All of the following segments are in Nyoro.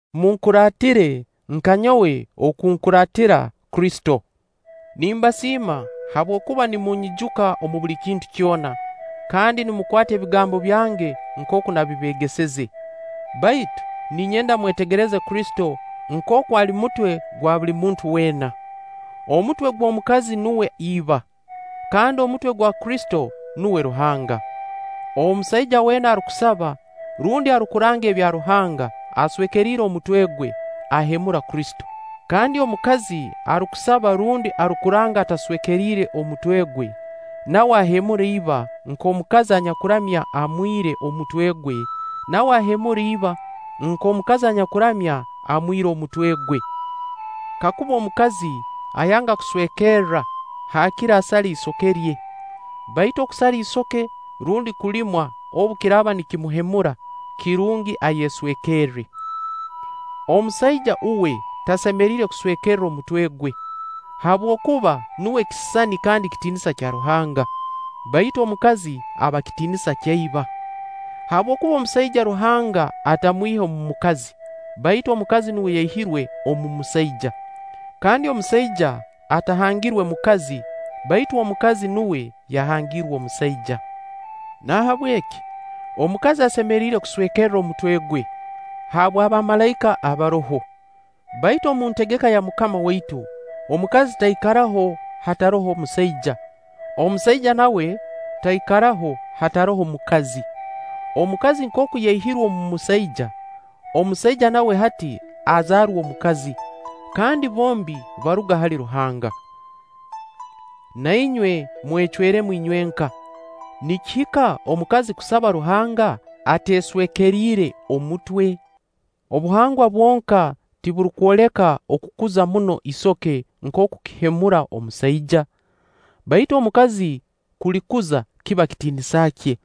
Munkuraatire nka nyowe oku nkuraatira Kristo. Nimbasiima habwokuba nimunyijuka omu buli kintu kyona, kandi nimukwata ebigambo byange nkooku nabibeegeseze. Baitu ninyenda mwetegereze Kristo nkooku ali mutwe gwa buli muntu weena. Omutwe gw'omukazi nuwe iba, kandi omutwe gwa Kristo nuwe Ruhanga. Omusaija weena arukusaba rundi arukuranga ebya Ruhanga aswekeriire omutwe gwe, ahemura Kristo. Kandi omukazi arukusaba rundi arukuranga ataswekeriire omutwe gwe, nawe ahemura iba-nk'omukazi anyakuramya amwire omutwe gwe, nawe ahemura iba-nk'omukazi anyakuramya amwire omutwe gwe. Kakuba omukazi ayanga kweswekerra, haakire asale isoke rye; baitu okusara isoke rundi kulimwa obu kiraaba nikimuhemura, kirungi ayeswekerre. Omusaija, uwe tasemeriire kuswekerra omutwe gwe, habwokuba nuwe kisisani kandi kitiinisa kya Ruhanga; baitu omukazi aba kitiinisa kya iba. (Habwokuba omusaija Ruhanga atamwihe omu mukazi, baitu omukazi nuwe yaihirwe omu musaija. Kandi omusaija atahangirwe mukazi, baitu omukazi nuwe yahangiirwe omusaija.) Nahabweki omukazi asemeriire kuswekerra omutwe gwe, habw'abamalaika abaroho. (Baitu omu ntegeka ya MUKAMA waitu, omukazi taikaraho hataroho musaija; omusaija nawe taikaraho hataroho mukazi. Omukazi nkooku yaihirwe omu musaija, omusaija nawe hati azaarwa omukazi; kandi bombi baruga hali Ruhanga.) Na inywe mwecweremu inywenka, nikihika omukazi kusaba Ruhanga ateeswekeriire omutwe? Obuhangwa bwonka tiburukwoleka okukuza muno isoke nkooku kihemura omusaija? Baitu omukazi kulikuza kiba kitiinisa kye.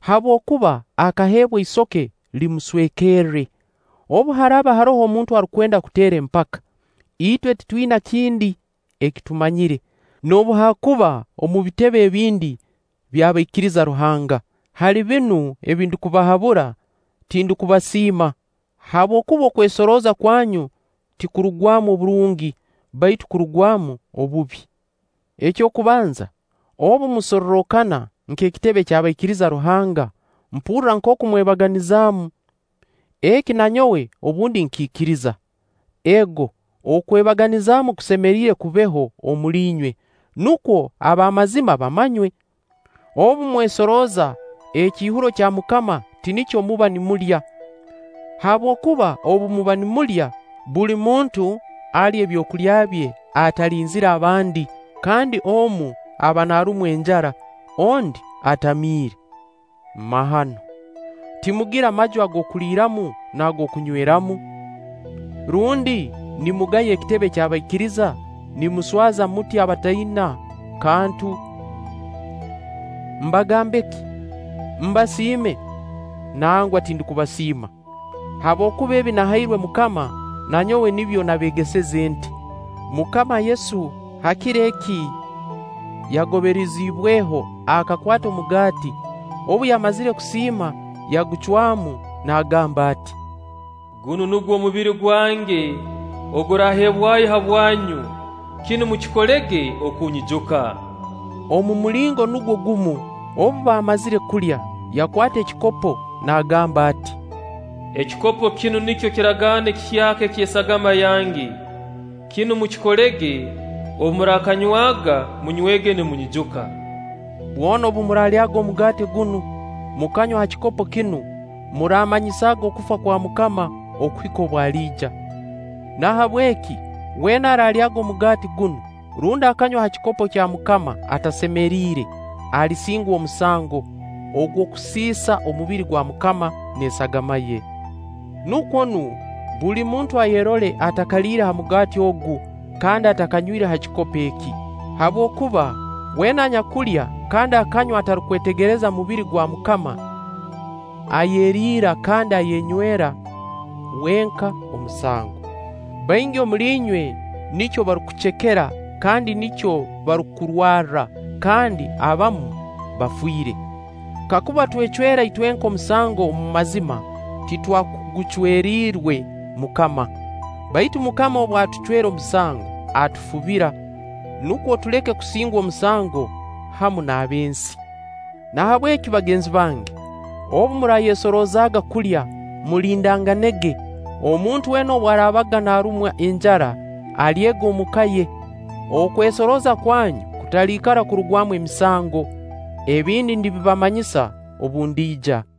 Habwokuba akaheebwa isoke limuswekerre. Obu haraaba haroho omuntu arukwenda kuteera empaka, itwe titwina kindi eki tumanyire, noobu haakuba omu bitebe ebindi by'abaikiriza Ruhanga. Hali binu ebi ndukubahabura, tindukubasiima, habwokuba okwesorooza kwanyu tikurugwamu oburungi baitu kurugwamu obubi. Eky'okubanza, obu musorrokana nk'ekitebe ky'abaikiriza Ruhanga, mpurra nkooku mwebaganizaamu. Eki na nyowe obundi nkiikiriza. Ego okwebaganizaamu kusemeriire kubeho omuli inywe, nukwo ab'a mazima bamanywe. Obu mwesorooza, ekiihuro kya MUKAMA tinikyo muba nimulya. Habwokuba obu muba nimulya, buli muntu alya ebyokulya bye atalinzire abandi, kandi omu aba naarumwa enjara, ondi atamiire. Mahano! Timugira maju ag'okuliiramu n'ag'okunyweramu? Rundi nimugaya ekitebe ky'abaikiriza, nimuswaza muti abataina kantu? Mbagambe ki? Mbasiime? Nangwa, tindukubasiima. Habwokuba ebi nahairwe MUKAMA, na nyowe nibyo nabeegeseze nti: MUKAMA Yesu ha kiro eki yagoberiziibweho, akakwata omugaati, obu yamazire kusiima, yagucwamu naagamba ati: “Gunu nugwo mubiri gwange oguraaheebwayo habwanyu. Kinu mukikolege okunyijuka.” Omu mulingo nugwo gumu obu baamazire kulya, yakwata ekikopo nagamba ati: “Ekikopo kinu nikyo kiragaano ekihyaka eky'esagama yange. Kinu mukikolege, obu muraakanywaga, munywege nimunyijuka.” Bwona obu muraalyaga omugaati gunu mukanywa ha kikopo kinu, muraamanyisaaga okufa kwa MUKAMA okuhika obu aliija. Nahabweki weena araalyaga omugaati gunu, rundi akanywa ha kikopo kya MUKAMA atasemeriire, alisingwa omusango ogw'okusiisa omubiri gwa MUKAMA n'esagama ye. Nukwo nu, buli muntu ayerole atakaliire ha mugaati ogu kandi atakanywire ha kikopo eki. Habwokuba weena anyakulya kandi akanywa atarukwetegereza mubiri gwa MUKAMA, ayeriira kandi ayenywera wenka omusango. Baingi omuli inywe nikyo barukucekera kandi nikyo barukurwarra, kandi abamu bafiire. Kakuba twecwera itwenka omusango omu mazima, titwakugucweriirwe MUKAMA. Baitu MUKAMA obu atucwera omusango, atufubira; nukwo tuleke kusingwa omusango hamu n'ab'ensi. Nahabweki bagenzi bange, obu muraayesoroozaaga kulya, mulindanganege omuntu weena obu araabaga naarumwa enjara, alyege omuka ye-okwesorooza kwanyu kutaliikara kurugwamu emisango. Ebindi ndibibamanyisa obu ndiija.